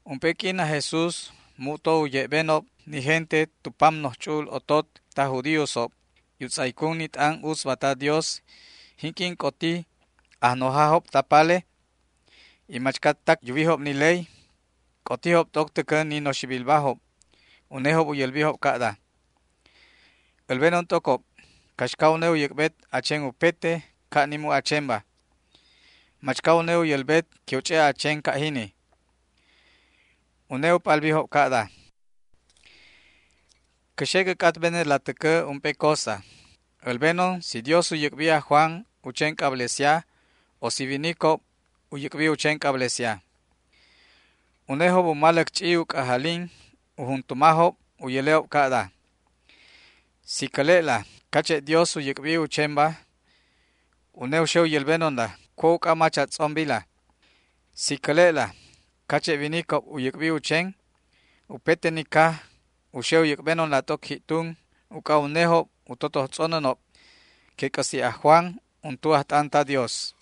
Ump'e q'uin aj Jesús mu'to u ye'benob ni gente tu pam noj ch'u'ul otot taj judíosob y u tz'aycun ni t'an utzba ta Dios jinq'uin c'otijob ajnojajob palejob y machcatac yuwijob ni ley. C'otijob t'oc täcä ni noxibilbajob. Unejob u yälbijob ca'da: ―Älbenon t'ocob caxca une u yäc'bet a chen upete ca' ni mu' a chenba. ¿Machca une u yälbet que u ch'e' a chen ca' jini? Une u p'albijob ca'da: ―Cä xe cä c'atbenetla täcä ump'e cosa. Älbenon si Dios u yäc'bi aj Juan u chen c'ablesia, o si winicob u yäc'bijob u chen c'ablesia. Unejob u maläc ch'i u c'ajalin u juntumajob u yäle'ob ca'da: ―Si cäle'la cache' Dios u yäc'bi u chenba, une u xe u yälbenonla cua' uc'a mach cä tz'ombila. Si cäle'la cache' winicob u yäc'bi u chen, upete ni caj u xe u yäc'benonla t'oc ji'tun uc'a unejob u totoj tz'onänob que c'äsi' aj Juan untu ajt'an ta Dios.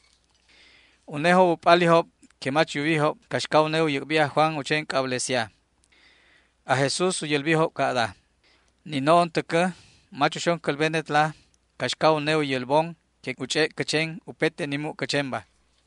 Unejob u p'alijob que mach yuwijob caxca une u yäc'bi aj Juan u chen c'ablesia. Aj Jesús u yälbijob ca'da: ―Ni no'on täcä mach uxon cälbenetla caxca une u yälbon que u ch'e' cä chen upete ni mu' cä chenba.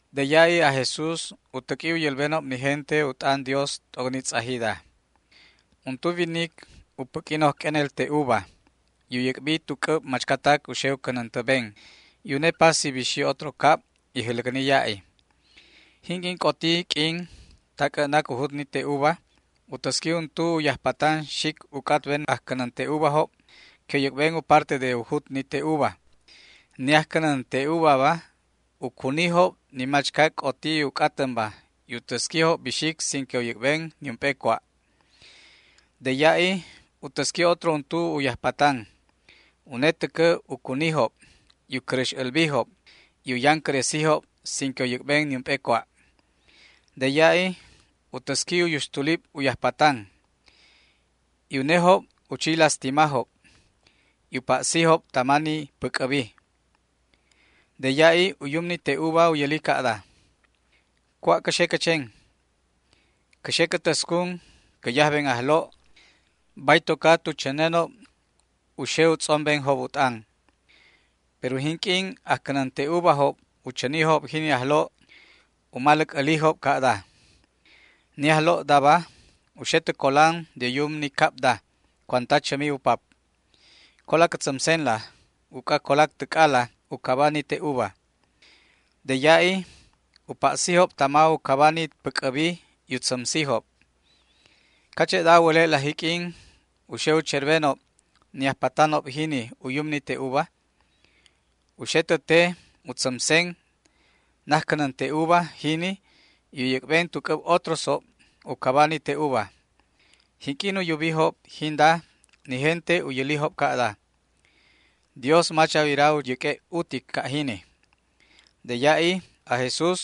De ya'i aj Jesús u täq'ui u yälbenob ni gente u t'an Dios t'oc ni tz'ajida: ―Untu winic u päq'ui noj q'uenel te'uva y u yäc'bijob tu c'äb machcatac u xe u cänäntäben, y une pasi bixi otro cab y jäläcni ya'i. Jinq'uin c'oti q'uin ta c'ä'nac u jut ni te'uva u täsqui untu u yajpatan xic u c'atben ajcänän te'uvajob que u yäc'ben u parte de u jut ni te'uva. Ni ajcänän te'uvaba u cunijob ni machcatac c'oti u c'atänba y u täsquijob bixic sin que u yäc'ben niump'e cua'. De ya'i u täsqui otro untu u yajpatan. Une täcä u cunijob y u cäräx älbijob y u yancäresijob sin que u yäc'ben niump'e cua'. De ya'i u täsqui u yuxtulib u yajpatan, y unejob u chi lastimajob y u pa'sijob tama ni päc'äbi. ’De ya'i u yum ni te'uva u yäli ca'da: “¿Cua' cä xe cä chen? Cä xe cä täscun cä yajben ajlo', bay toca tu chänenob u xe u tz'ombenob u t'an”. Pero jinq'uin ajcänän te'uvajob u chänijob jini ajlo' u maläc älijob ca'da: “Ni ajlo'daba u xe tä colan de u yum ni cabda cuanta chämi u pap. Cola cä tzämsenla uc'a colac täc'ala u caba ni te'uva”. De ya'i u pa'sijob tama u caba ni päc'äbi y u tzämsijob. ¿Cache'da a wäle'la jiq'uin u xe u cherbenob ni ajpatanob jini u yum ni te'uva? U xe tä te u tzämsen najcänän te'uva jini y u yäc'ben tu c'äb otrosjob u caba ni te'uva. Jinq'uin u yubijob jinda, ni gente u yälijob ca'da: ―¡Dios mach a wira u yäq'ue' utic ca' jini! De ya'i aj Jesús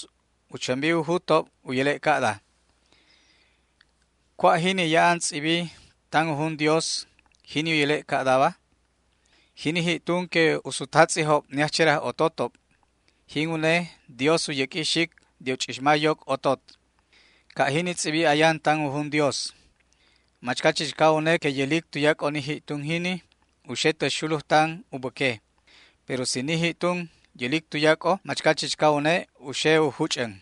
u chämbi u jutob u yäle' ca'da: ―¿Cua' ti jini ya'an tz'ibi tan u jun Dios jiq'uin, jini u yäle' ca'daba?: Jini ji'tun que u sutjatz'ijob ni ajcheraj ototob, jin une Dios u yäq'ui xic de u ch'ixma yoc otot. Ca' jini tz'ibi ayan tan u jun Dios. Machca chichca une que yälic tuyac'o ni ji'tun jini u xe tä xulujtan u bäque, pero si ni ji'tun yälic tuyac'o machca chichca une u xe u juch'än.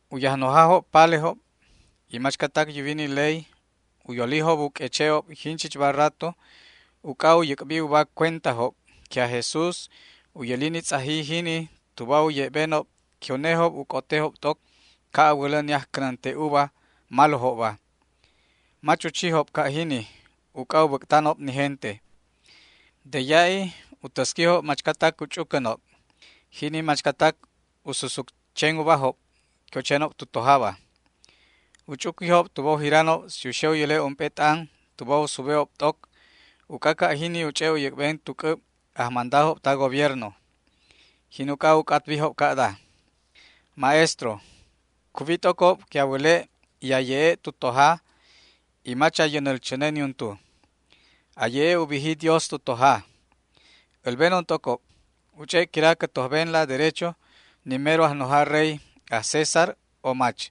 U yajnojajob palejob y machcatac yuwi ni ley u yolijob u q'ueche'ob jinchichba rato uc'a u yäc'bi uba cuentajob que aj Jesús u yäli ni tz'aji jini tuba u ye'benob que unejob u c'otejob t'oc ca' a wälä ni ajcänän te'uva malojobba. Mach u chijob ca' jini uc'a u bäc'tanob ni gente. De ya'i u täsquijob machcatac u ch'ucänob, jini machcatac u susut chen ubajob que u chenob tu tojaba. U ch'uquijob tuba u jiranob si u xe u yäle' ump'e t'an tuba u sube'ob t'ocba, uc'a ca' jini u ch'e' u yäc'ben tu c'äb ajmandajob ta gobiernoba. Jin uc'a u c'atbijob ca'da: ―Maestro, cuwi t'ocob que a wäle' y a ye'e' tu toja y mach a yänäl chäne niuntu. A ye'e' u biji Dios tu toja. Älbenon t'ocob: ¿U ch'e' quira cä tojbenla derecho ni mero ajnoja rey, aj César, o mach?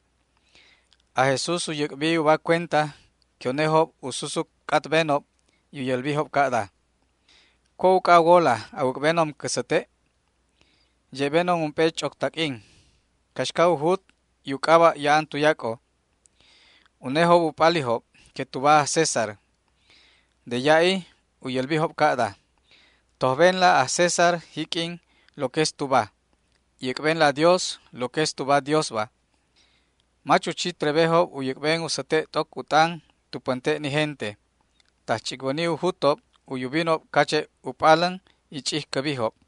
Aj Jesús u yäc'bi uba cuenta que unejob u susut c'atbenob y u yälbijob ca'da: ―¿Cua' uc'a a wola a wäc'benon cä säte'? Ye'benon ump'e ch'oc taq'uin. ¿Caxca u jut y u c'aba' ya'an tuyac'o? Unejob u p'alijob que tuba aj César. De ya'i u yälbijob ca'da: ―Tojbenla aj César jiq'uin lo que es tuba, y äc'benla Dios lo que es tuba Diosba. Mach u chi trebejob u yäc'ben u säte' t'oc u t'an tu pänte' ni gente. Tajch'icwäni u jutob u yubinob cache' u p'alän, y ch'ijcäbijob.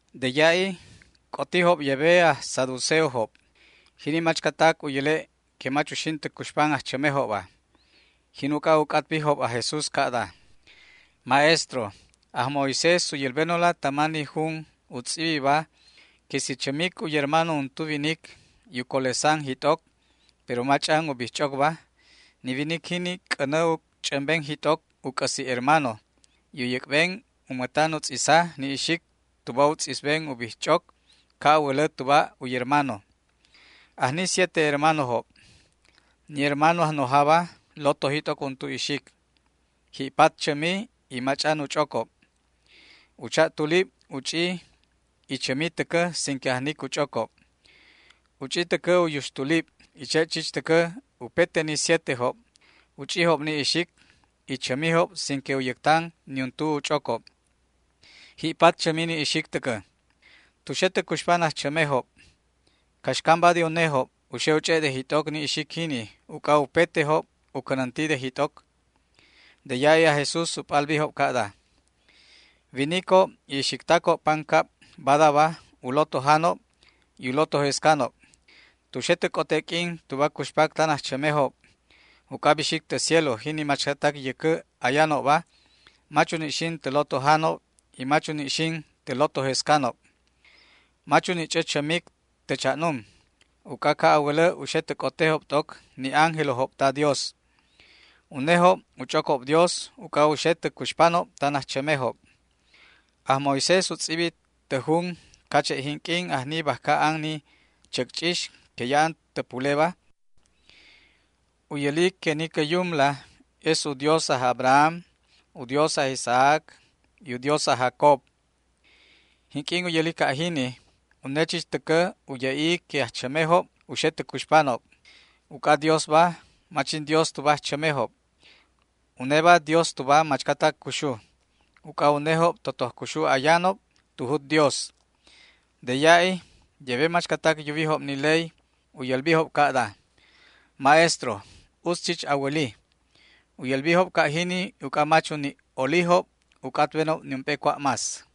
De ya'i c'otijob yebe aj saduceojob, jini machcatac u yäle' que mach uxin tä cuxpan ajchämejobba. Jin uc'a u c'atbijob aj Jesús ca'da: ―Maestro, aj Moisés u yälbenonla tama ni jun u tz'ibiba que si chämic u yermano untu winic y u colesan jit'oc, pero mach'an u ch'ocobba, ni winic jini c'änä u ch'ämben jit'oc u c'äsi' hermano y u yäc'ben u mätan u tz'isa ni ixic tuba u tz'isben u bijch'oc, ca' a wälä tuba u yermano. Ajni siete hermanojob. Ni hermano ajnojaba lotoji t'oc untu ixic, y ji'pat chämi y mach'an u ch'ocob. U cha'tulib u ch'i y chämi täcä sin que ajnic u ch'ocob. U ch'i täcä u yuxtulib, y che' chich täcä upete ni sietejob u ch'ijob ni ixic, y chämijob sin que u yäctan niuntu u ch'ocob. Ji'pat chämi ni ixic täcä. Tu xe tä cuxpan ajchämejob, jiq'uin, ¿caxcamba de unejob u xe u ch'e' de jit'oc ni ixic jini, uc'a upete ni sietejob u cänäntijob de jit'oc? De ya'i aj Jesús u p'albijob ca'da: ―Winicob y ixictacob pancab badaba u lotojanob y u lotojescanob. Tu xe tä c'ote q'uin tuba cuxpac tan ajchämejob uc'a bixic tä cielo jini machcatac yäcä ayanobba, mach uni' xin tä lotojanob y mach uni' xin tä lotojescanob. Mach u ni' ch'ä chämic tä cha'num, uc'a ca' a wälä u xe tä c'otejob t'oc ni ángelojob ta Dios. Unejob u ch'ocob Dios uc'a u xe tä cuxpanob tan ajchämejob. Aj Moisés u tz'ibi tä jun cache' jinq'uin ajni bajca an ni chäcch'ix que ya'an tä puleba, u yäli que ni cä Yumla es u Dios aj Abraham, u Dios aj Isaac y u Dios aj Jacob. Jinq'uin u yäli ca' jini, une chich täcä u ye'i que ajchämejob u xe tä cuxpanob. Uc'a Diosba mach jin Dios tuba ajchämejob. Uneba Dios tuba machcatac cuxuba. Uc'a unejob totoj cuxu ayanob tu jut Dios. De ya'i yebe machcatac yuwijob ni ley u yälbijob ca'da: ―Maestro, utz chich a wäli. U yälbijob ca' jini uc'a mach u ni' olijob u c'atbenob niump'e cua' más.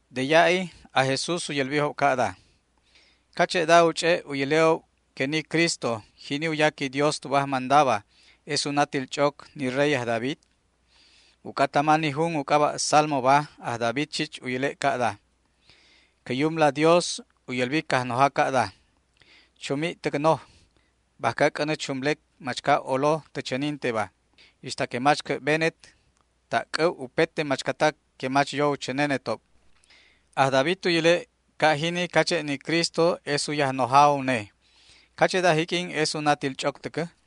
De ya'i aj Jesús u yälbijob ca'da: ―¿Cache'da u ch'e' u yäle'ob que ni Cristo, jini u yaqui Dios tuba ajmandaba, es u natil ch'oc ni rey aj David? Uc'a tama ni jun u c'aba' Salmoba aj David chich u yäle' ca'da: Cä Yumla Dios u yälbi Cajnoja ca'da: “Chumi' täc noj, bajca c'änä chumlec machca olo tä chäninteba, ixta que mach cä'benet ta' c'äb upete machcatac que mach yo u chänenetob”. Aj David u yäle' ca' jini cache' ni Cristo es u Yajnoja une. ¿Cache'da jiq'uin es u natil ch'oc täcä?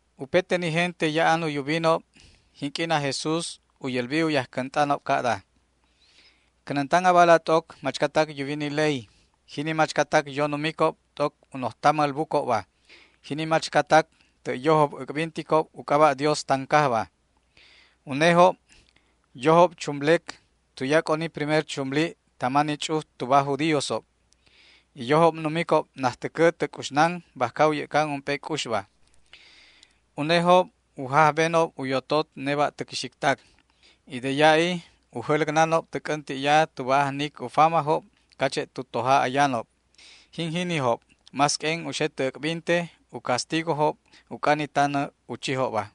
Upete ni gente ya'an u yubinob jinq'uin aj Jesús u yälbijob u yajcänt'anob ca'da: ―Cänäntan abala t'oc machcatac yuwi ni ley, jini machcatac yo numicob t'oc u noj tamäl bucobba, jini machcatac tä' yojob äc'binticob u c'aba' Dios tan cajba. Unejob yojob chumlecob tuyac'o ni primer chumlib tama ni ch'uj tuba aj judíosob, y yojob numicob najtäcä tä c'uxnan bajca u yä'can ump'e c'uxba. Unejob u jajbenob u yototob neba'täc ixictac y de ya'i u susuc jäläcnanob tä c'änti'ya tuba ajnic u famajob cache' tu toja ayanob. Jin jinijob más q'uen u xe tä äc'binte u castigojob uc'a ni tanä u chijobba.